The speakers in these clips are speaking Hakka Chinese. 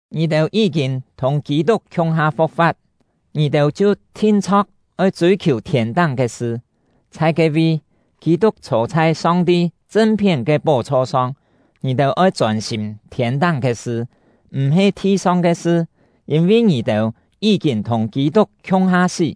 Ngì-têu yí-kîn thùng Kî-tuk khiung-ha fu̍k-fa̍t, ngì-têu chhiu thin-chho̍k oi chûi-khiù thiên-táng ke sṳ; chhai ke-vi, Kî-tuk chhô chhai Song-ti chṳn-phién ke pó-chho-song. Ngì-têu oi chôn-sîm thiên-táng ke sṳ, m̀-he thi-song ke sṳ. Yîn-vi ngì-têu yí-kîn thùng Kî-tuk khiung-ha sí,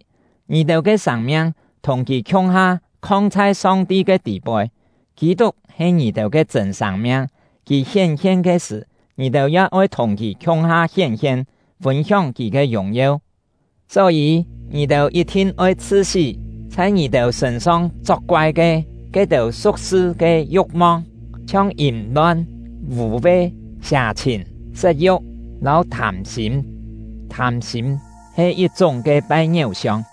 ngì-têu ke sâng-miang thùng kì khiung-ha khong chhai Song-ti ke tî-poi. Kî-tuk he ngì-têu ke chṳ̂n sâng-miang; kì hién-hien ke sṳ̀, ngì-têu ya oi thùng kì khiung-ha hién-hien, fûn-hióng kì ke yùng-yeu. Só-yî, ngì-têu yit-thin oi chhṳ-sí chhai ngì-têu sṳ̂n-song chok-koai ke ke-têu su̍k-sṳ ke yu̍k-mong, chhiong yìm-lon, vû-ve, sià-chhìn, set-yu̍k, lâu thâm-sîm (thâm-sîm he yit-chúng ke pai ngiéu-siong).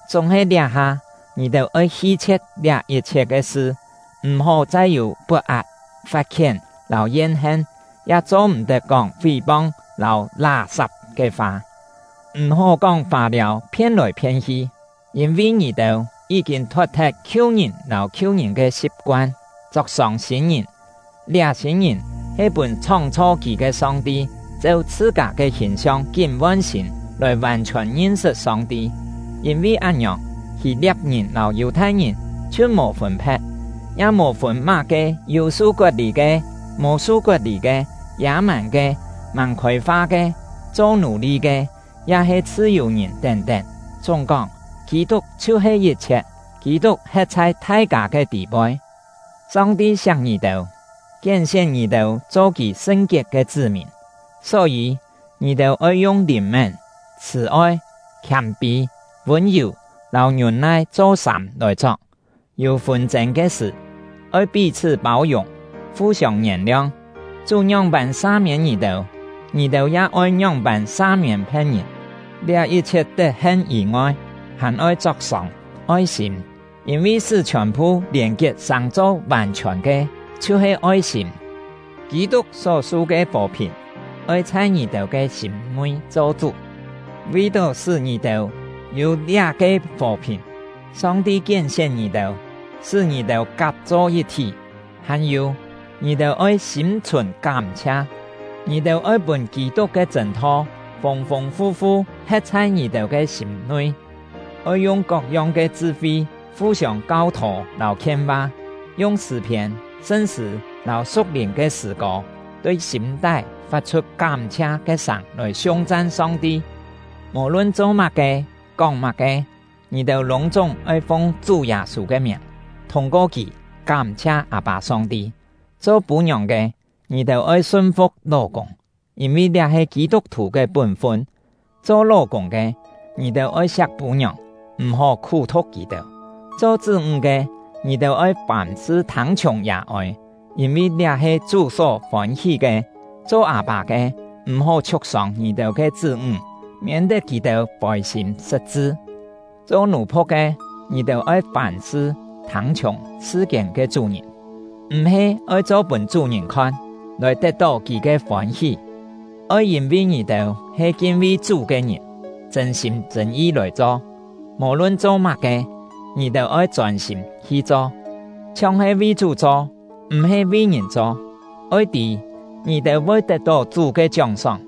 Chúng-he liá-ha, ngì-têu oi hi-chhie̍t liá yit-chhiet ke sṳ: M̀-hó chai yû pot-at, fat-khién, lâu yen-hen; ya cho-m̀-tet kóng fí-pong lâu lá-sap ke fa. M̀-hó kóng fâ-liâu phien-lòi phien-hi, yîn-vi ngì-têu yí-kîn thot-thet khiu-ngìn lâu khiu-ngìn ke si̍p-koan, chok-sông sîn-ngìn. Liá sîn-ngìn he pûn chhóng-chho kì ke Song-ti cheu chhṳ-kâ ke hìn-siong kín von-sîn, lòi vàn-chhiòn ngin-sṳt Song-ti. Yîn-vi án-ngiòng, Hî-lia̍p-ngìn lâu Yù-thai-ngìn chhiu mò fûn-phe̍t; ya mò fûn má-ke yû su-kot-lî ke, mò su-kot-lî ke, yâ-màn ke, màng khôi-fa ke, cho nù-li ke, ya-he chhṳ-yù-ngìn tén-tén. Chúng-kóng, Kî-tuk chhiu-he yit-chhiet, Kî-tuk he̍t chhai thai-kâ ke tî-poi. Song-ti siak ngì-têu, kién-sién ngì-têu cho Kì sṳn-kiet ke chṳ́-mìn. Só-yî, ngì-têu oi yung lìn-mén, chhṳ̀-oi, khiâm-pî, vûn-yù, lâu ngiûn-nai cho-sâm lòi chok. Yû fûn-chên ke sṳ̀, oi pí-chhṳ́ pâu-yùng, fu-siông ngièn-liong. Chú ngióng-pân sa-miên ngì-têu, ngì-têu ya oi ngióng-pân sa-miên phe̍t-ngìn. Liá yit-chhiet tet-hen yî-ngoi, hàn-oi chok-sông oi-sîm; yîn-vi sṳ́ chhiòn-phu lièn-kiet sàng-cho vàn-chhiòn ke chhiu-he oi-sîm. Kî-tuk só-su ke fò-phìn oi chhai ngì-têu ke sîm-nui cho chú; vi-tó sṳ́ ngì-têu yû liá-ke fò-phìn, Song-ti kién-sién ngì-têu, sṳ́ ngì-têu kap-cho yit-thí. Hàn-yû, ngì-têu oi sîm-chhùn kám-chhia. Ngì-têu oi pûn Kî-tuk ke chṳ̂n-tho fûng-fûng fu-fu he̍t chhai ngì-têu ke sîm-nui. Oi yung kok-yong ke chṳ-fi fu-siông kau-thô lâu khien-va, yung sṳ̂-phiên, sṳn-sṳ̂, lâu su̍k-lìn ke sṳ̂-kô, tui sîm-tái fat-chhut kám-chhia ke sâng lòi siung-chan Song-ti. Mò-lun cho má-ke, kóng má-ke, ngì-têu lûng-chúng oi fung Chú Yâ-sû ke miàng, thûng-ko kì kám-chhia Â-pâ Song-ti. Cho pû-ngiòng ke, ngì-têu oi sun-fu̍k ló-kûng; yîn-vi liá he Kî-tuk-thù ke pún-fun. Cho ló-kûng ke, ngì-têu oi siak pû-ngiòng, m̀-hó khú-thu̍k kì-têu. Cho chṳ́-ńg ke, ngì-têu oi fàm-sṳ thâng-chhiùng yà-ôi; yîn-vi liá he Chú só fôn-hí ke. Cho â-pâ ke, m̀-hó chhiuk-sông ngì-têu ke chṳ́-ńg, miên-tet kì-têu fôi-sîm sṳt-chṳ. Cho nù-phu̍k ke, ngì-têu oi fàm-sṳ thâng-chhiùng sṳ-kiên ke chú-ngìn. M̀-he oi cho pûn chú-ngìn khon, lòi tet-tó kì-têu ke fôn-hí; oi yîn-vi ngì-têu he kin-vi Chú ke ngìn, chṳ̂n-sîm chṳ̂n-yi lòi cho. Mò-lun cho má-ke, ngì-têu oi chôn-sîm hi cho, chhiong he vi Chú cho, m̀-he vi ngìn cho. Oi tî, ngì-têu voi tet-tó Chú ke chióng-sóng,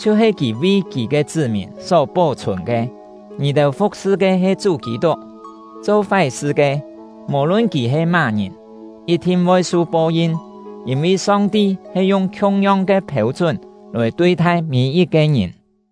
chhiu-he kì vi kì ke chṳ́-mìn só pó-chhùn ke. Ngì-têu fu̍k-sṳ ke he Chú Kî-tuk. Cho fái-sṳ ke, mò-lun kì he má-ngìn, yit-thin voi su po-yin, yîn-vi Song-ti he yung khiung-yong ke phêu-chún lòi tui-thai mî-yit-ke ngìn.